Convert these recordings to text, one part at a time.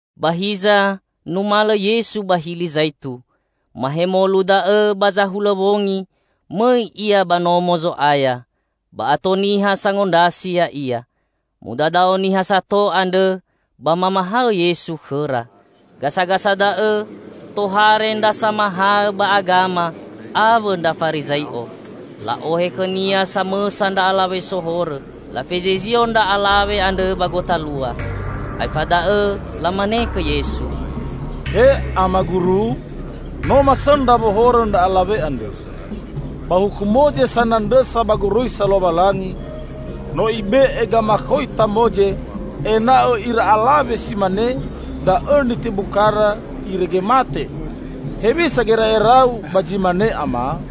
[Ba hiza numalõ Yesu ba Hili Zaitu.] [Mahemolu da'õ ba zahulõ wongi mõi Ia ba Nomo Zo'aya, ba ato niha sangondrasi Ya'ia. Mudadao niha sato andrõ, ba mamahaõ Yesu khõra.] [Gasagasa da'õ, tohare ndra Samahaõ ba Agama awõ ndra Farizai'o, la'ohe khõ-Nia samõsa ndra alawe sohorõ. Lafezizio ndra alawe andrõ ba gotalua,] [aefa da'õ lamane khõ Yesu, "He Ama guru, no masõndra wohorõ ndra alawe andre.] [Ba Huku Moze sanandrõsa ba goroisa Lowalangi, no ibe'e gamakhoita Moze ena'õ ira alawe si mane da'õ nitebu kara irege mate. Hewisa gera'era-U ba zi mane Ama?"]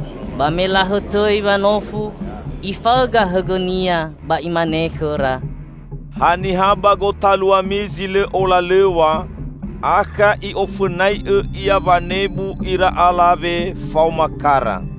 [Ba me lahõtõi wanofu, Ifaõga hõgõ-Nia ba Imane khõra, "Haniha ba gotaluami zi lõ olalõw̃a, akha i'ofõnai'õ ia wanebu ira alawe faoma kara."]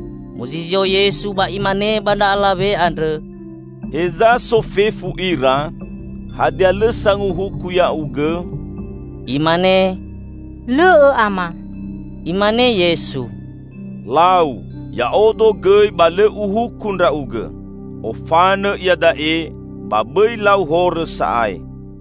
[Muzizio Yesu ba Imane ba ndra alawe andrõ, "Heza so fefu ira? Hadia lõ sanguhuku ya'ugõ?"] [Imane, "Lõ'õ Ama." Imane Yesu, "Lau, Ya'odo gõi ba lõ Uhuku ndra'ugõ. Ofanõ iada'e, ba bõi lau horõ sa'ae."]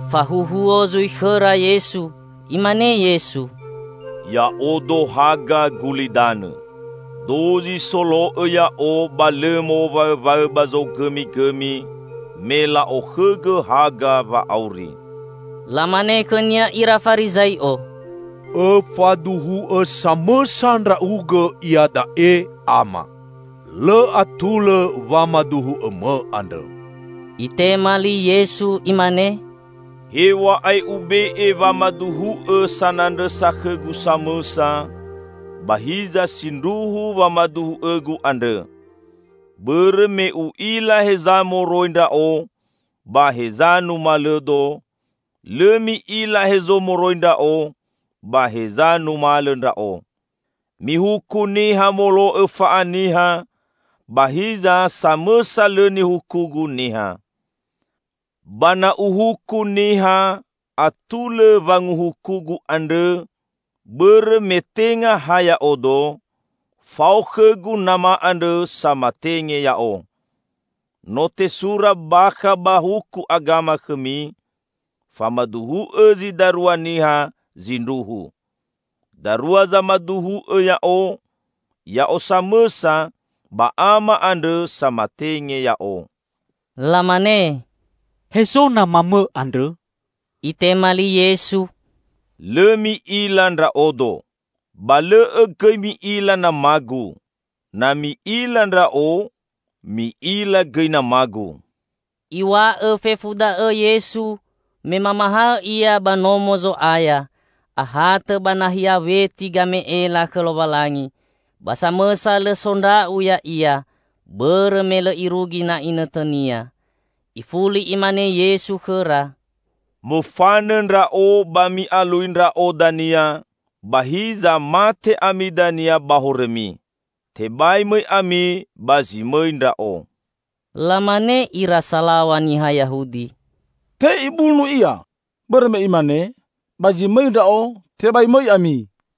Fahuhuo zui khõra Yesu. Imane Yesu, "Ya'odo haga gulidanõ. Dozi solo'õ Ya'o ba lõ mowaõwaõ ba zogõmigõmi, me la'okhõgõ haga wa'auri." Lamane khõ-Nia ira Farizai'o, "Õfaduhu'õ samõsa Ndra'ugõ iada'e, Ama. Lõ atulõ wamaduhu'õ-Mõ andrõ!" Itema li Yesu Imane, "Hew̃a'ae Ube'e wamaduhu'õ sanandrõsa khõ-Gu samõsa, ba hiza sindruhu wamaduhu'õ-Gu andrõ; bõrõ me U'ila heza moroi Ndra'o ba heza numalõ-Do Lõ mi'ila hezo moroi Ndra'o ba heza numalõ Ndra'o. Mihuku niha molo'õ fa'aniha, ba hiza samõsa lõ nihuku-Gu niha. Ba na Uhuku niha, atulõ wanguhuku-Gu andrõ, bõrõ me tenga ha Ya'odo; fao khõ-Gu Nama andrõ samatenge Ya'o. No tesura bakha ba huku agama khõmi; famaduhu'õ zi darua niha zindruhu. Darua zamaduhu'õ Ya'o -- Ya'o samõsa ba Ama andrõ samatenge Ya'o." Lamane, "Hezo Nama-Mõ andrõ?" Itema li Yesu, "Lõ mi'ila Ndra'odo. Ba lõ'õ gõi mi'ila Nama-Gu. Na mi'ila Ndra'o, mi'ila gõi Nama-Gu." Iw̃a'õ fefu da'õ Yesu me mamahaõ Ia ba Nomo Zo'aya ahatõ ba nahia weti game'ela khõ Lowalangi. Ba samõsa lõ sondra'u Ya'ia, bõrõ me lõ irugi na inõtõ-Nia. Ifuli Imane Yesu khõra, "Mofanõ Ndra'o, ba mi'alui Ndra'o dania, ba hiza mate ami dania ba horõmi. Tebai mõi ami ba zi mõi Ndra'o." Lamane ira salaw̃a niha Yahudi, "Te Ibunu Ia, bõrõ me imane, 'Ba zi mõi ndra'o, tebai mõi ami.'"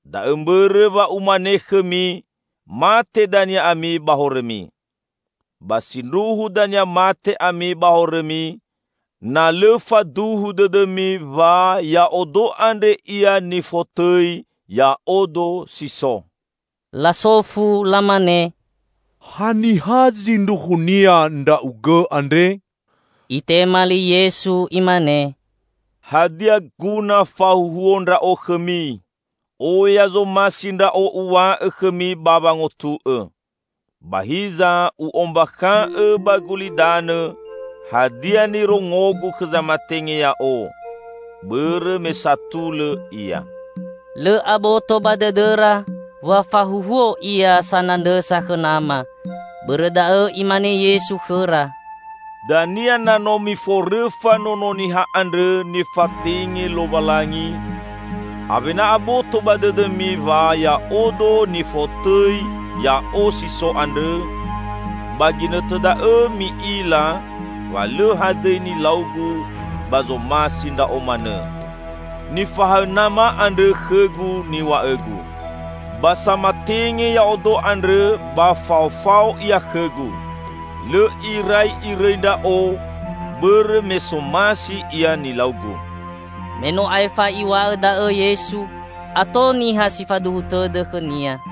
Da'õ mbõrõ wa Umane khõmi mate dania ami ba horõmi. Ba sindruhu dania mate ami ba horõmi, na lõ faduhu dõdõmi wa 'Ya'odo andre Ia nifotõi YA'ODO SI SO'." Lasofu lamane, "Haniha zindruhunia Ndra'ugõ andre?" Itema li Yesu Imane, "Hadia guna fahuhuo Ndra'o khõmi! Oya zomasi Ndra'o Uw̃a'õ khõmi ba wangotu'õ. Ba hiza U'ombakha'õ ba gulidanõ hadia nirongo-Gu khõ zamatenge Ya'o -- bõrõ me satulõ Ia." Lõ aboto ba dõdõra wa fahuhuo Ia sanandrõsa khõ Nama. Bõrõ da'õ Imane Yesu khõra, "Dania na no miforõfa Nono Niha andrõ nifatenge Lowalangi, awena aboto ba dõdõmi wa 'Ya'odo, nifotõi YA'O SI SO andrõ', ba ginõtõ da'õ mi'ila wa lõ hadõi nilau-Gu ba zomasi Ndra'o manõ. Nifahaõ Nama andrõ khõ-Gu niw̃a'õ-Gu. Ba samatenge Ya'odo andrõ ba faofao Ia khõ-Gu. Lõ irai Irõi Ndra'o bõrõ me somasi Ia nilau-Gu." Me no aefa Iw̃a'õ da'õ Yesu, ato niha si faduhu tõdõ khõ-Nia.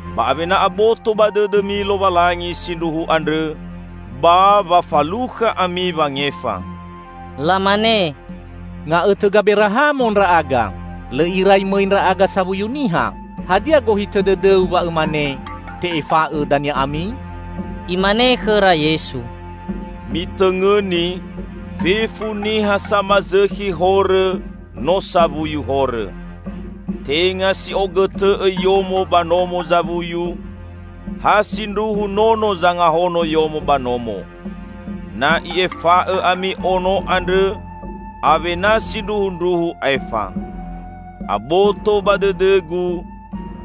ba awena aboto ba dõdõmi Lowalangi sindruhu andrõ, ba wa falukha ami wangefa." Lamane, "Nga'õtõ Gaberahamo ndra'aga. Lõ irai mõi ndra'aga sawuyu niha! Hadia gohitõ dõdõ-U wa Õmane, 'Te'efa'õ dania ami'?" Imane khõra Yesu, "Mitõngõni, fefu niha samazõkhi horõ no sawuyu horõ. Tenga si ogõtõ'õ yomo ba nomo zawuyu; ha sindruhu nono zangahono yomo ba nomo. Na I'efa'õ ami Ono andrõ awena sindruhundruhu aefa. Aboto ba dõdõ-Gu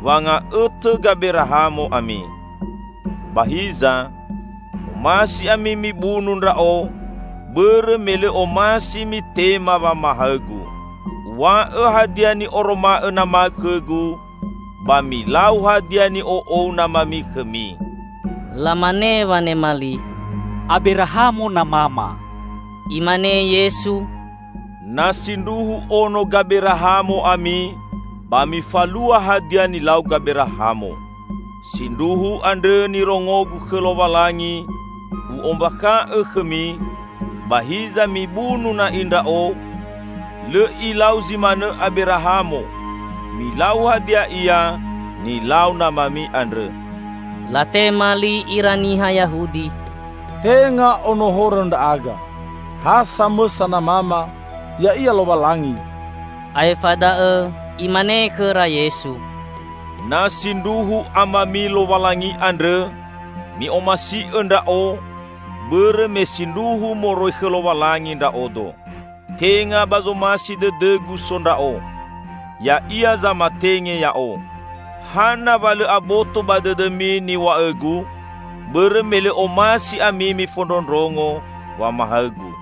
wa nga'õtõ Gaberahamo ami. Ba hiza, omasi ami mibunu Ndra'o bõrõ me lõ omasi mitema wamahaõ-Gu. Uw̃a'õ hadia ni'oroma'õ Nama khõ-Gu; ba milau hadia ni'o'ou namami khõmi." Lamane wanema li, "Aberahamo namama." Imane Yesu, "Na sindruhu ono Gaberahamo ami, ba mifalua hadia nilau Gaberahamo. Sindruhu andrõ nirongo-Gu khõ Lowalangi U'ombakha'õ khõmi, ba hiza mibunu na'i Ndra'o. Lõ ilau zi manõ Aberahamo! Milau hadia ia nilau namami andrõ." Latema li ira niha Yahudi, "Tenga ono horõ ndra'aga. Ha samõsa namama ya'ia Lowalangi." Aefa da'õ Imane khõra Yesu, "Na sindruhu Amami Lowalangi andrõ, mi'omasi'õ Ndra'o, bõrõ me sindruhu moroi khõ Lowalangi Ndra'odo. Tenga ba zomasi dõdõ-Gu so Ndra'o. Ya'ia zamatenge Ya'o. Hana wa lõ aboto ba dõdõmi niw̃a'õ-Gu? Bõrõ me lõ omasi ami mifondrondrongo wamahaõ-Gu.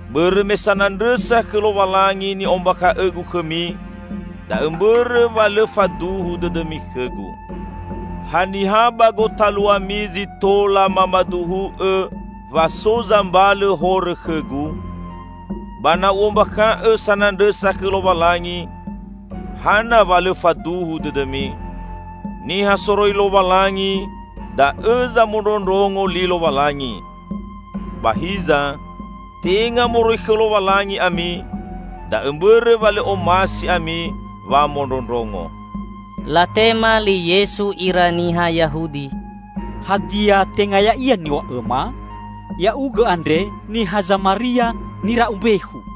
Bõrõ me sanandrõsa khõ Lowalangi ni'ombakha'õ-Gu khõmi, da'õ mbõrõ wa lõ faduhu dõdõmi khõ-Gu. Haniha ba gotaluami zi tola mamaduhu'õ wa so zambalõ horõ khõ-Gu? Ba na U'ombakha'õ sanandrõsa khõ Lowalangi, hana wa lõ faduhu dõdõmi? Niha soroi Lowalangi, da'õ zamondrondrongo li Lowalangi. Ba hiza, tenga moroi khõ Lowalangi ami, da'õ mbõrõ wa lõ omasi ami wamondrondrongo." Latema li Yesu ira niha Yahudi, "Hadia tenga ya'ia niw̃a'õma? Ya'ugõ andre niha Zamaria nira'u mbekhu."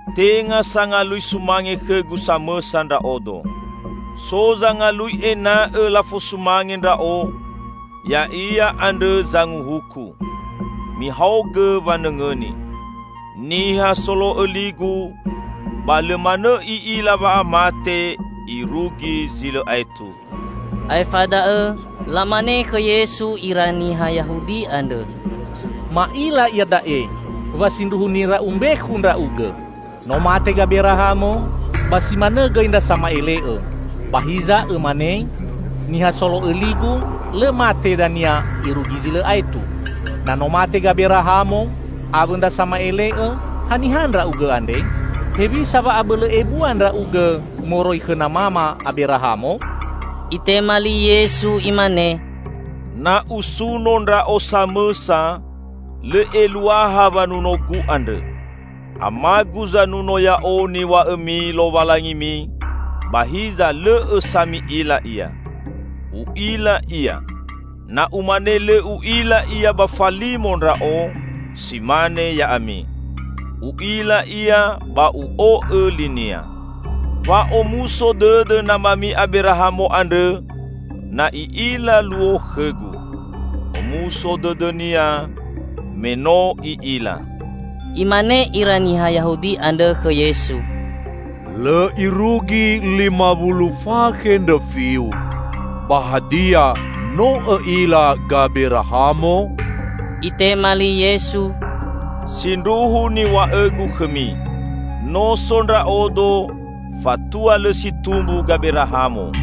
Tenga sangalui sumange khõ-Gu samõsa Ndra'odo. So zangalui ena'õ lafosumange Ndra'o, Ya'ia andrõ zanguhuku. Mihaogõ wanõngõni: niha solo'õ li-Gu, ba lõ manõ i'ila wa'amate irugi zi lõ aetu." Aefa da'õ lamane khõ Yesu ira niha Yahudi andrõ, "Ma'ila iada'e wa sindruhu nira'u mbekhu Ndra'ugõ! No mate Gaberahamo, ba si manõ gõi ndra sama'ele'õ. Ba hiza Õmane, 'Niha solo'õ li-Gu, lõ mate dania irugi zi lõ aetu.' Na no mate Gaberahamo, awõ ndra sama'ele'õ, haniha Ndra'ugõ andre? Hewisa wa abõlõ ebua Ndra'ugõ moroi khõ namama Aberahamo!" Itema li Yesu Imane, "Na Usuno Ndra'o samõsa, lõ eluaha wanuno-Gu andrõ. Ama-Gu zanuno Ya'o niw̃a'õmi Lowalangimi, ba hiza lõ'õ sa mi'ila Ia. U'ila Ia. Na Umane lõ U'ila Ia ba falimo Ndra'o, si mane ya'ami. U'ila Ia ba U'o'õ li-Nia. Wa'omuso dõdõ namami Aberahamo andrõ na i'ila luo khõ-Gu. Omuso dõdõnia, me no i'ila!" Imane ira niha Yahudi andrõ khõ Yesu, "Lõ irugi lima wulu fakhe ndrõfi-U, ba hadia no õ'ila Gaberahamo?" Itema li Yesu, "Sindruhu niw̃a'õ-Gu khõmi: no so Ndra'odo, fatua lõ si tumbu Gaberahamo."